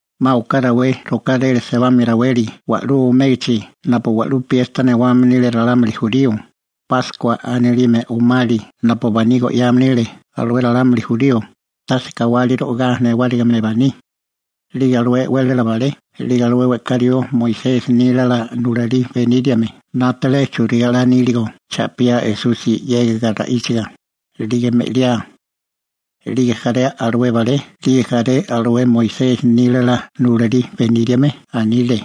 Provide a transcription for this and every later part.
'Ma oká rawé rokáréle sebamia raweli wa'lú omégachi napu wa'lú piesta newame nile ralámuli jurío, Páskua anilime omali napu baní go'yame nile alué ralámuli jurío, tase kawali (lebarura) ro'igá newárigime baní. 'Lige alué e'wélala balé 'lige alué we'ká rió Moisesi nílala nulalí beníriame 'nátale churigá 'la níligo cha'piá Esusi 'yégiga ra'íchaga, 'lige me'liá. 'Lige jaré alué balé 'lige jaré alué Moisesi nílala nulalí beníriame anile: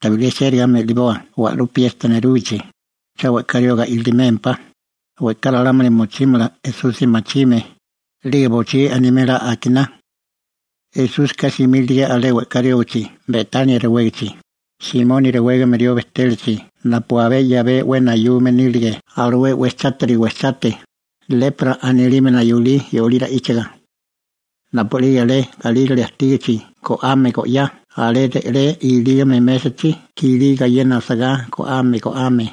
―Tabilé chérigá me'liboa wa'lú piesta nerúgichi, cha we'ká rioga ilimémpá, we'ká ralámuli mochímala Esusi machime, 'lige bochí animela akiná. Esúsika simílige alé we'ká riógichi Betania rewégichi, Simoni rewégame rió bejtélachi napu abé 'yabé 'we nayume nílige alué 'we chátiri wejchagoni («lepra» anilime nayulí yolí ra'íchaga). Napu'lige alé galírale ajtígichi go'ame go'yá alé re'lé ilígame mésachi kilí gayena asagá go'yame nile go'ame,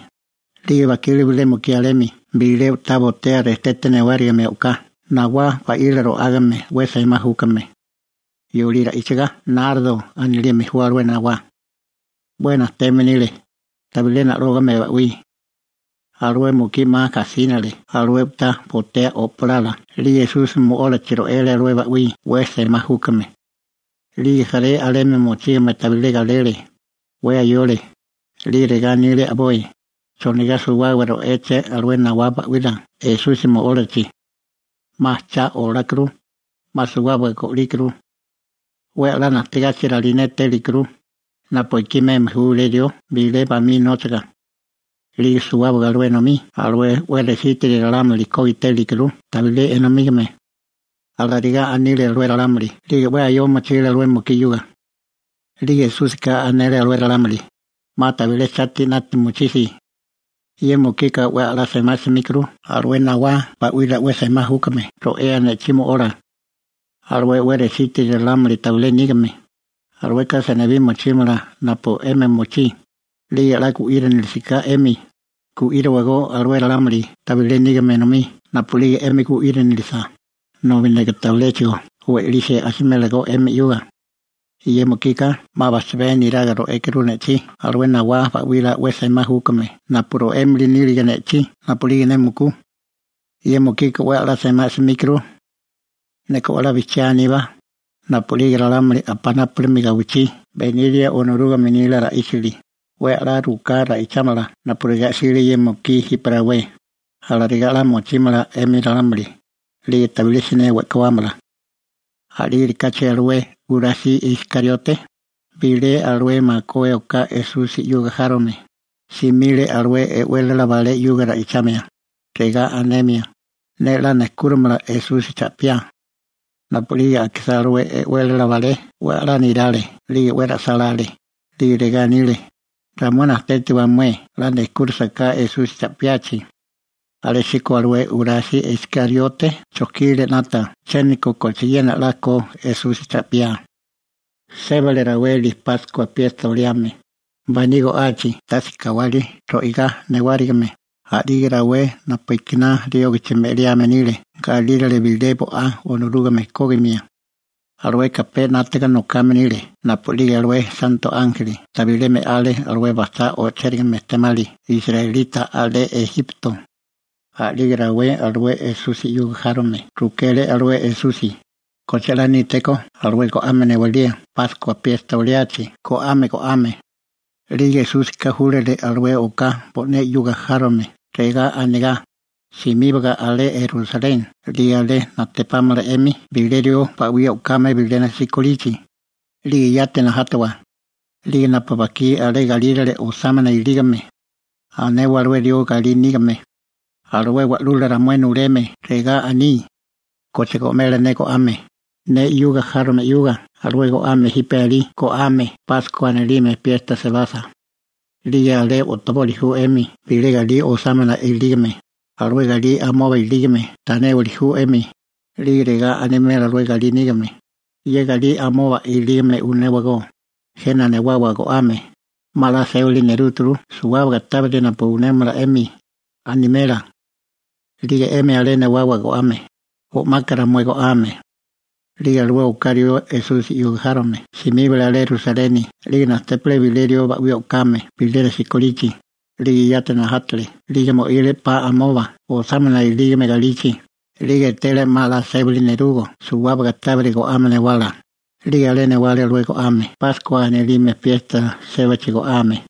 a'lige bajkile bilé mukí alemi bilé u'tá botea rejtete newárigime o'ká nawá ba'wila ro'ágame 'we semá júkame. (Yolí ra'íchaga «nardo» anilime ju alué nawá.) 'We najteme nile, tabilé na'lógame ba'wí. Alué mukí 'ma gajsínale alué u'tá botea o'palala 'lige Esusi mo'ólachi ro'ele alué ba'wí 'we semá júkame. 'Lige jaré alemi mochígame tabilé galele, 'we ayole, 'lige regá anile a'boi: ―¿Chonigá suwábaga ro'éleché alué nawá ba'wila Esusi mo'ólachi? 'Ma cha olákuru, 'ma suwábaga go'líkuru. 'We a'lá najtegachi ralinétélikuru, napu ekí meme ju bilé rió bilé bamí nóchaga. 'Lige suwábaga alué enomí alué 'we resítiri ralámuli kógitélikuru tabilé enomígame. Alarigá anile alué ralámuli 'lige 'we ayoa mochile alué mukí 'yuga. 'Liko Esúsika anele alué ralámuli: ―'Ma tabilé chati 'nata mochisi. Ye mukika 'we a'lá semá 'smíkuru alué nawá ba'wila 'we semá júkame ro'ea ne'chí mo'ola. Alué 'we resítiri ralámuli tabilé nígame, alueka senibí mochímala napu 'emi mochí, 'lige 'la gu'írinilisiká 'emi, gu'íriwagó alué ralámuli tabilé nígame enomí napu'lige 'emi gu'írinilisa, nobi neka tabiléchigo we'lisi asimélagó 'emi 'yuga. Ye mukika 'ma bajchabé neraga ro'ékuru ne'chí alué nawá ba'wila 'we semá júkame napu ro'émili nílige ne'chí napu'lige ne mukú. Ye mukika 'we a'lá semá 'smíkuru. Neka 'we a'lá bijchiá aníbá, napu'lige ralámuli napunápurimi gawichí beniria Onorúgame nila ra'íchili, 'we a'lá ruká ra'ichámala napurigá 'sile ye mukí jipe rawé, alarigá 'la machigá mochímala ralámuli, 'lige tabilé siné we'kuámala. A'lígerikáchi alué Jurasi Iskariote, bilé alué makué oká Esusi 'yuga járome, simile alué e'wélala balé 'yuga ra'ichamia, regá anemia: ―Ne 'la nejkúrimala Esusi cha'piá. Napu'lige akisá alué e'wélala balé 'we a'lá nerale 'lige 'we ra'sálále, 'lige regá anile: ―Ramué najtétiwa mué 'la nejkúrisaká Esusi cha'piachi. Alésíko alué Jurasi Iskariote chojkile 'nata chiéniko kochiena 'la ko Esusi cha'piá. Sébale raweli Páskua piesta oliame, baní go'achi tase kawali ro'igá newárigime, a'lige rawé napu ekiná riógichi me'liame nile galírale bilé bo'á Onorúgame kógimia. (Alueka pe 'nátaga nokame nile napu'lige alué santo ánjeli tabilé me'ale alué bajchá o'chérigame ejtemali israelita alé Ejipto.) A'lige rawé alué Esusi 'yuga járome rukele alué Esusi: ―¿Koche 'la nítékó alué go'ame newalía Páskua piesta oliachi go'yame? 'Lige Esúsika júlale oká alué bo'né 'yuga járome regá anegá: ―Simíbaga alé Rusaleni, 'lige alé najtepámala 'emi bilé rió ba'wí o'kame bilena sikolichi, 'lige yati najátawa, 'lige napu bajkí alé galírale osámana ilígame, anewa alué rió galí nígame: «Alué wa'lula ramué nuleme regá aní: ¿Koche go'mela ne go'ame ne 'yuga járome 'yuga alué go'ame jipe alí go'yame Páskua anilime piesta sebasa?» 'Lige alé o'toboli ju 'emi bilé galí osámana ilígame, alué galí amoba ilígame tanéwili ju 'emi, 'lige regá animela alué galí nígame: «Ye galí amoba ilígame unéwagó, jena newawa go'ame, 'ma 'la sébali nerúturu suwábaga tábiri napu unémala 'emi», animela. 'Lige 'emi alé newawa go'ame, o'maka ramué go'ame. 'Lige alué oká rió Esusi 'yuga járome simíbale alé Rusaleni 'lige najtépale bilé rió ba'wí o'kame bilena sikolichi, 'lige yati najátale 'lige mo'ile 'pa amoba osámana ilígame galichi, 'lige etele 'ma 'la sébale nerugo suwábaga tábiri go'ame newala, 'lige alé newale alué go'ame Páskua anilime piesta sébachi go'yame.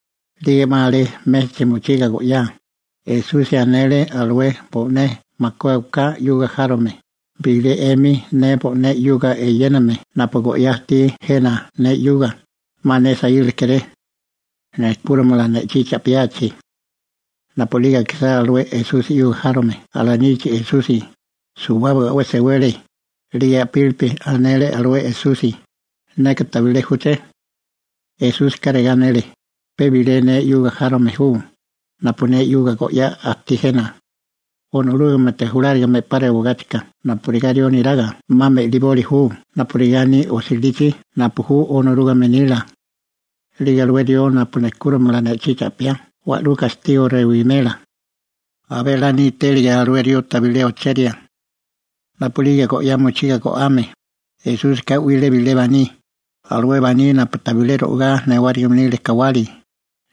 'Lige 'ma alé mésachi mochiga go'yá, Esusi anele alué bo'né makué oká 'yuga járome: ―Bilé 'emi ne bo'né 'yuga eyéname napu go'yá ajtí jena ne 'yuga, 'ma ne saíla kéré. Nejkúrimala ne'chí cha'piachi. Napu'lige akisá alué Esusi 'yuga járome alanichi Esusi, suwábaga 'we sewele, 'lige a'pílipi anele alué Esusi: ―Neka tabilé júché. 'Lige Esúsika regá anele: ―Pe bilé ne 'yuga járome ju, napu ne 'yuga go'yá ajtí jena. Onorúgamete julárigame 'pa rewagáchika napurigá rió neraga 'ma me'liboli ju napurigá aní osilichi napu ju Onorúgame nila. 'Lige alué rió napu nejkúrimala ne'chí cha'piá wa'lú gastigo rewimela. Abé 'la nítélige alué rió tabilé ocheria. Napu'lige go'yá mochiga go'ame, Esúsika 'wile bilé baní, alué baní napu tabilé ro'igá newárigime nile kawali,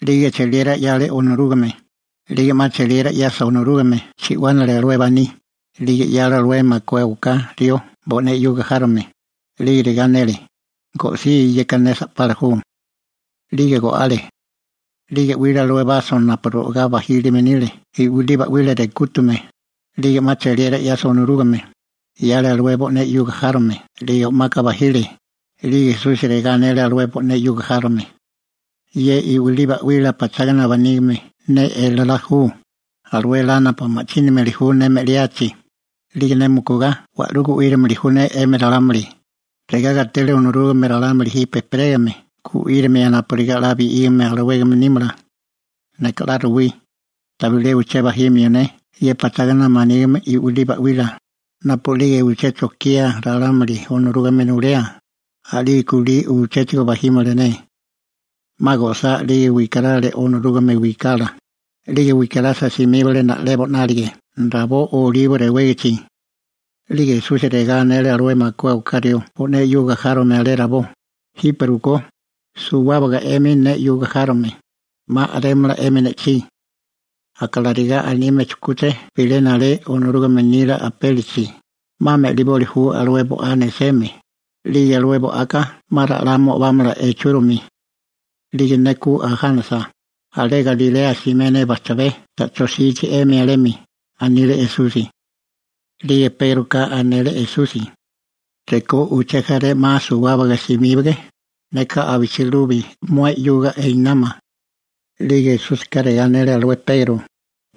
'lige cheliera 'yale Onorúgame, 'lige 'ma cheliera 'yasa Onorúgame, chi'wánale alué baní, 'lige 'yale alué makué oká rió bo'né 'yuga járome, 'lige regá anele: ―Go'sí, yeka ne sa'pala ju. 'Lige go'ale. 'Lige 'wile alué baso napu ro'agá bajílime nile i'wilí ba'wila rekútame, 'lige 'ma cheliera 'yasa Onorúgame, 'yale alué bo'né 'yuga járome 'lige o'maka bajile, 'lige Esusi regá anele alué bo'né 'yuga járome: ―Ye i'wilí ba'wila pachágana manígime ne elalá ju, alué elá napu ma'chínimili ju ne me'liachi, 'lige ne mukugá wa'lú gu'írimili ju ne 'emi ralámuli, regá gatele Onorúgame ralámuli jipe ejperégame gu'írimia napurigá 'la bi'wígame alawégame nímala. Neka 'la ruwí, tabilé uché bajimio ne ye pachágana manígime i'wilí ba'wila, napu'lige uché chokía ralámuli Onorúgame nulea, a'lige kulí uchéchigo bajímala ne. 'Ma go'sá 'lige wikarale Onorúgame wikala, 'lige wikarasa simíbale na'lebo 'nálige rabó Olibo rewégichi. 'Lige Esusi regá anele alué makué oká rió bo'né 'yuga járome alé rabó: ―Jipe rukó, suwábaga 'emi ne 'yuga járome, 'ma a'rémala 'emi ne'chí. Aka regá anime chujkúché bilena alé Onorúgame nila apélichi: «'Ma me'liboli ju alué bo'á neseme, 'lige alué bo'aka 'ma ra'lá mo'bámala ichúrimi.» 'Lige ne ku ajánasa, alé Galilea simé ne bajchabé ta'chó jsichi 'emi alemi ―anile Esusi. 'Lige Pégroka anele Esusi: ―Rekó uché jaré 'ma suwábaga simíbige, neka abichilubi mué 'yuga einámala. 'Lige Esúsika regá anele alué Pegro: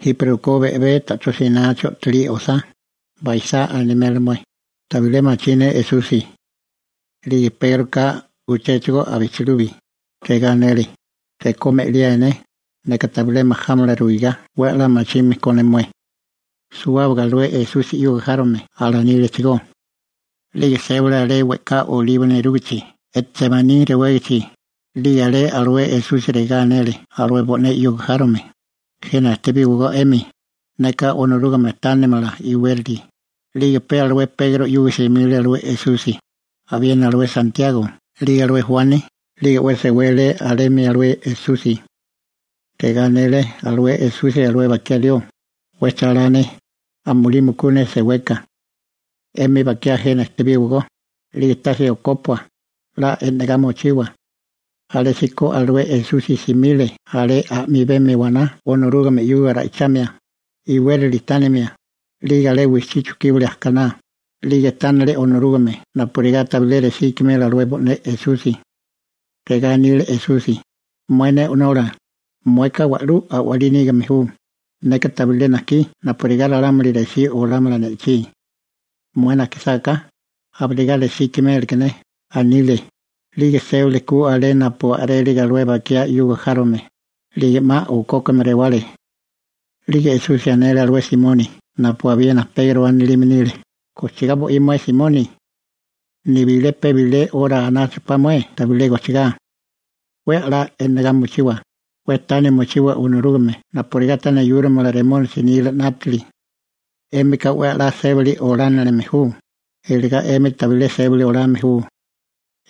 ―Jipe rukó be'bé ta'chó sinachi o'tolí osá, baisá animela mué: «Tabilé machí ne Esusi.» 'Lige Pégroka uchéchigo abichilubi, regá anele: ―Rekó me'liáe ne, neka tabilé majámala ruigá 'we a'lá machime ko ne mué. Suwábaga alué Esusi 'yuga járome alanílechigó. 'Lige sébale alé we'ká Olibo nerúgachi Jetsemaní rewégichi, 'lige alé alué Esusi regá anele alué bo'né 'yuga járome: ―Jena ejtebíwagó 'emi, neka Onorúgame tánimala iwérali. 'Lige pe alué Pegro 'yuga simile alué Esusi, abiena alué Santiago (Akobo) 'lige alué Juani, 'lige 'we sewele alemi alué Esusi. Regá anele alué Esusi alué bakiá rió: ―'We chálá ne, amulí mukú ne seweka. 'Emi bakiá jena ejtebíwagó, 'lige tase okópua, 'la e'negá mochiwa. Alésíko alué Esusi simile abé a'mibemi waná Onorúgame 'yuga ra'ichamia, iwérali tánimia, 'lige alé wijchí chujkíbale ajkaná, 'lige tánale Onorúgame napurigá tabilé resí ikimela alué bo'né Esusi. Regá anile Esusi: ―Mué ne O'nola («Abba» anile bo'né ra'ichálila.), mueka wa'lú a'walí nígame ju, neka tabilé najkí napurigá ralámuli resí olámala ne'chí. Mué najkisáká, abirigá resí ikiméleké ne ―anile. 'Lige sébale ku alé napu a'rélige alué bakiá bo'né 'yuga járome, 'lige 'ma okókame rewale. 'Lige Esusi anele alué Simoni (napu abiena Pegro anilime nile): ―¿Gojchigá bo'í mué Simoni? ¿Nibilé pe bilé 'ora anáchapá mué tabilé gojchigá? 'We a'lá e'negá mochiwa, 'we tana mochiwa Onorúgame napurigá ta neyúrimala Remónisi nila 'nátili. 'Émika 'we a'lá sébali olánilime ju, eligá 'emi tabilé sébali olame ju.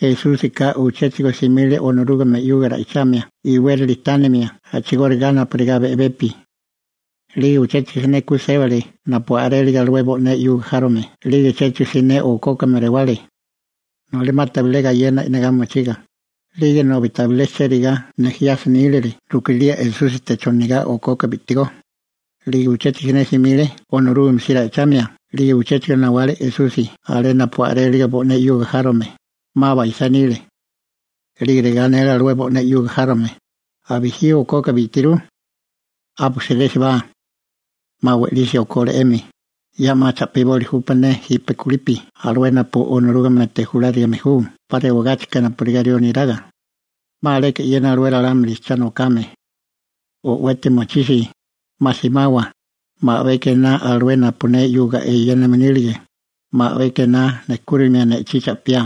Esúsika uchéchigo simile Onorúgame 'yuga ra'ichamia iwérali tánimia a'chigóriga napurigá pe be'bepi. 'Lige uchéchigo siné ku sébale napu a'rélige alué bo'né 'yuga járome 'lige uchéchigo siné okókame rewale. Noli 'ma tabilé gayena e'negá mochiga, 'lige nobi tabilé chérigá nejiasa nílile rukilía Esúsite chonigá okoka bi'tigó. 'Lige uchéchigo siné simile Onorúgame si ra'ichamia 'lige uchéchigo nawale Esusi alé napu a'rélige bo'né 'yuga járome, 'ma baisá nile. 'Lige regá anele bo'né 'yuga járome: ―¿Abijí okoka bi'tirú? 'A bujsirésibá. 'Ma we'lisi okole 'emi, ya 'ma cha'piboli júpá ne jipe kulipi alué napu Onorúgamete julárigame ju 'pa rewagáchika napurigá rió neraga. 'Ma aleka e'yena alué ralámuli cha nokame. ¡O'weti mochisi, 'ma simawa, 'ma a'beka ená alué napu ne 'yuga eyéname nílige, 'ma a'beka ená nejkúrimia ne'chí cha'piá!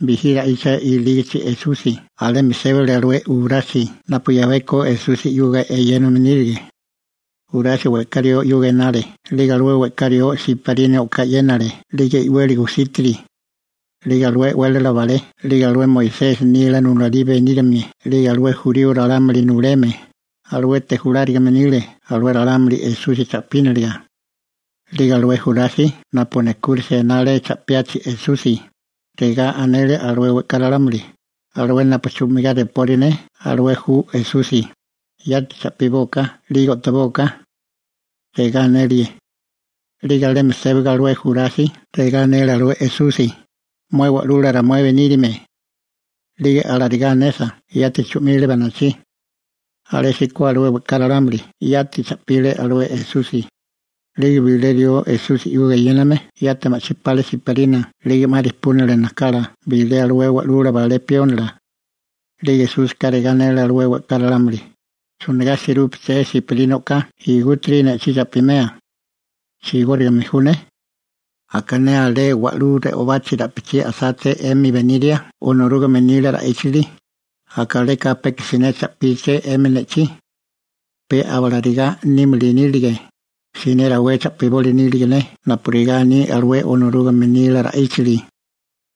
Bijí ra'icha ilígichi Esusi alemi sébale alué Jurasi napu 'yabeko Esusi 'yuga eyéname nílige. Jurasi we'ká rió 'yuga enale 'lige alué we'ká rió siparina o'ká e'yénale 'lige i'weli gusítiri. 'Lige alué e'wélala balé 'lige alué Moisesi nila nulalí beníriame 'lige alué jurío ralámuli nuleme, aluete julárigame nile alué ralámuli Esusi cha'píniliga. 'Lige alué Jurasi napu nejkúrisia enale cha'piachi Esusi, regá anele alué we'ká ralámuli: «Alué napu chu'migá repori ne alué ju Esusi, yati cha'pibóaká 'lige o'tobóaká», regá anele. 'Lige alemi sébaga alué Jurasi regá anele alué Esusi: ―¡Mué Wa'lula ramué beníriame! 'Lige alarigá anesa, yati chu'mile banachí. Alésíko alué we'ká ralámuli yati cha'pile alué Esusi. 'Lige bilé rió Esusi 'yuga eyéname yati ma'chí pale siparina 'lige 'ma rejpúnale najkala bilé alué wa'lula balé piónila. 'Lige Esúsika regá anele alué we'ká ralámuli: ―¿Chonigá sirúpaché siparina o'ká igútiri ne'chí cha'pimea? ¿Chigórigame ju ne? Aka ne alé wa'lú re'obachi ra'pichí a'sáché 'emi beniria Onorúgame nila ra'íchili, aka aleka peka siné cha'píché 'emi ne'chí. Peba alarigá nímili nílige, siné rawé cha'piboli nílige ne napurigá aní alué Onorúgame nila ra'íchili.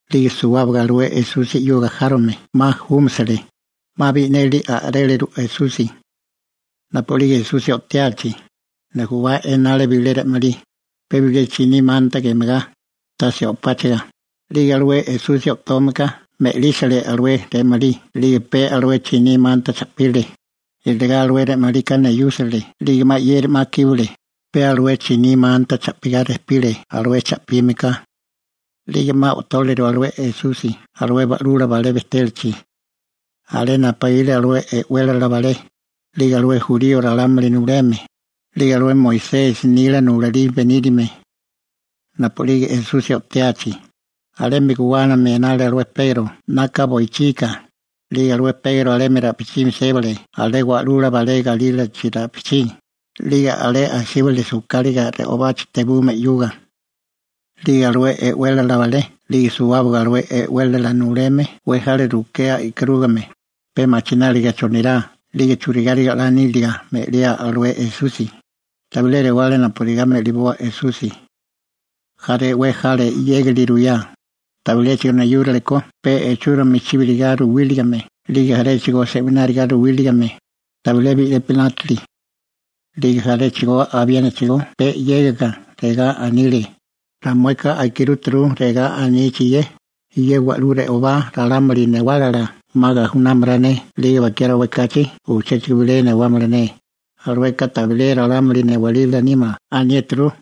'Liko suwábaga alué Esusi 'yuga járome 'ma júmasale, 'ma bi'neli a'réleru Esusi. Napu'lige Esusi o'tiachi, nujubá enale bilé re'malí, pe bilé chiní manta gemagá, tase o'páchaga, 'lige alué Esusi o'tome ka me'lísale alué re'malí 'lige pe alué chiní manta cha'pile, iligá alué re'malika neyúsale 'lige 'ma 'yeri 'ma kíbale, pe alué chiní manta cha'pigá rejpile alué cha'pime ka. 'Lige 'ma o'tóliru alué Esusi alué wa'lula balé bejtélachi. Alé napaíle alué e'wélala balé, 'lige alué jurío ralámuli nuleme, 'lige alué Moisesi nila nulalí beníriame. Napu'lige Esusi o'tiachi, alemi guwánami enale alué Pegro 'naka boichika, 'lige alué Pegro alemi ra'pichimi sébale alé wa'lula balé galílachi ra'pichí, 'lige alé asíbale sujkáliga re'obachi tebume 'yuga. 'Lige alué e'wélala balé 'lige suwábaga alué e'wélala nuleme 'we jale rukea e'karúriga, pe machináliga chonirá 'lige churigáriga 'la níliga me'liá alué Esusi, tabilé rewale napurigá me'liboa Esusi. Jaré 'we jale 'yégali ruyá, tabiléchigo neyúrale ko pe ichúromi chibirigá ruwíligame, 'lige jaréchigo se'wináriga ruwíligame, tabilé bi'lepi 'nátale. 'Lige jaréchigo abiénachigó pe 'yégiga, regá anile: ―Ramueka akirúturu regá anichi ye: «Ye wa'lú re'obá ralámuli newálala 'ma gajunámala ne 'lige bakiá rawé kachi uchéchigo bilé newámala ne, alueka tabilé ralámuli newalila nímala» aniéturu.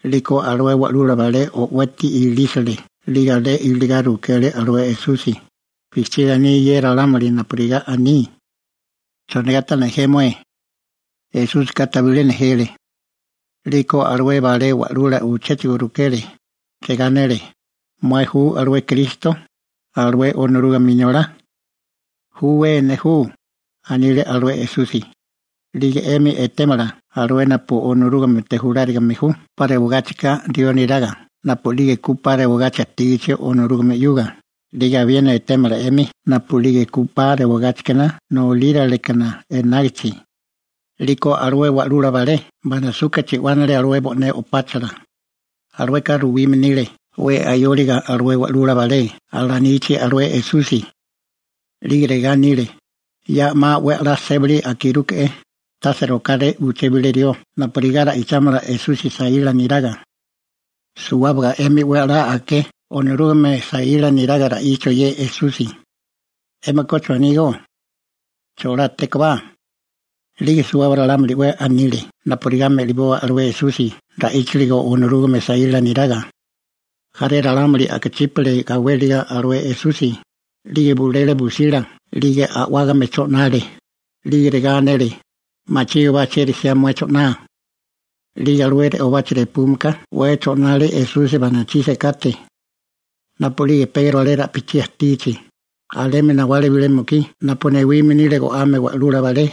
'Liko alué wa'lula balé o'weti ilísale, 'lige alé iligá rukele alué Esusi: ―¿Bijchiga aní ye ralámuli napurigá aní? ¿Chonigá ta nejé mué? Esúsika tabilé nejele. 'Liko alué balé wa'lula uchéchigo rukele, regá anele: ―¿Mué ju alué Kristo, alué Onorúgame Inolá? ―Júwé, ne ju ―anile alué Esusi―. 'Lige 'emi etémala alué napu Onorúgamete julárigame ju 'pa rewagáchika rió neraga napu'lige ku 'pa rewagachi ajtígachi Onorúgame 'yuga, 'lige abiena etémala 'emi napu'lige ku 'pa rewagáchikana nolíralekana enágichi. 'Liko alué wa'lula balé banasuka chi'wánale bo'né o'páchala. (Alueka ruwime nile 'we ayóligo alué wa'lula balé alanichi alué Esusi.) 'Lige regá anile: ―Ya 'ma 'we a'lá sébali akirúke'é, tase rokáré uché bilé rió napurigá ra'ichámala Esusi saíla neraga. Suwábaga 'emi 'we a'lá aké Onorúgame saíla niraga ra'ichio ye Esusi. ¿'Émika chonígó? ¿Cholátékobá? 'Lige suwábaga ralámuli 'we anile napurigá me'liboa alué Esusi ra'íchaligo Onorúgame saíla neraga. Jaré ralámuli a'kachípale gawéliga alué Esusi, 'lige bulele busila 'lige a'wágame o'chole, 'lige regá anele: ―¡Machígobá chieri 'siá mué o'choa! 'Lige alué re'obachi repúmeka 'we o'chole Esusi banachí sekate. Napu'lige Pegro alé ra'pichí ajtígichi, alemi nawale bilé mukí napu newime nile go'ame wa'lula balé,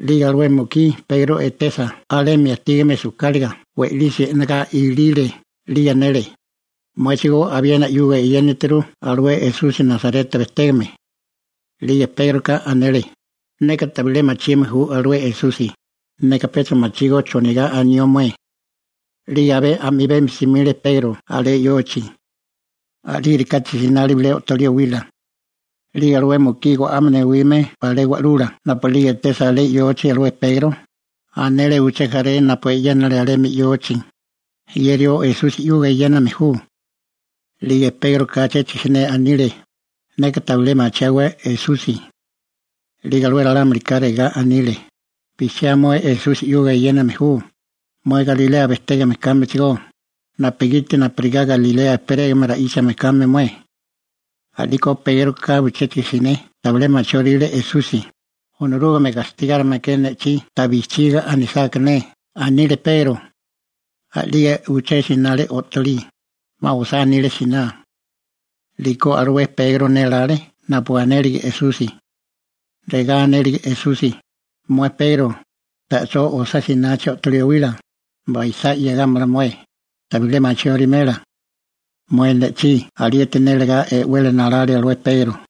'lige alué mukí Pegro etesa alemi ajtígame sujkáliga, we'lisi e'negá ilile, 'lige anele: ―Muéchigó abiena 'yuga eyénituru alué Esusi Nasareta bejtégame. 'Lige Pégroka anele: ―Neka tabilé machime ju alué Esusi, neka pecha machígó chonigá anió mué. 'Lige abé a'mibemi simile Pegro alé yochi. A'lígerikáchi sinale bilé o'tolí owila. 'Lige alué mukí go'ame newime balé wa'lula napu'lige etesa alé yochi alué Pegro, anele uché jaré napu e'yénale alemi yochi: ―Ye rió Esusi 'yuga eyéname ju. A'liko Pégroka chéchigo siné anile: ―Neka tabilé machiáwé Esusi. 'Lige alué ralámulika regá anile: ―Bijchiá mué alué Esusi 'yuga eyéname ju, mué Galilea bejtégame kámechigó, napugiti napurigá Galilea ejperégame ra'íchame kame mué. 'Liko Pégroka uchéchigo siné tabilé machióríle Esusi: ―Onorúgame gastigárime ke ne'chí ta bijchiga anisáká ne ―anile Pegro. A'lige uché sinale o'tolí, 'ma osá nile siná. 'Liko alué Pegro nélále napu anélige Esusi. Regá anélige Esusi: «Mué Pegro, ta'chó osá sinachi o'tolí owila, baisá 'yegámala mué, tabilé machióriméla mué ne'chí.» Alieti nélegá, e'wele nalale alué Pegro.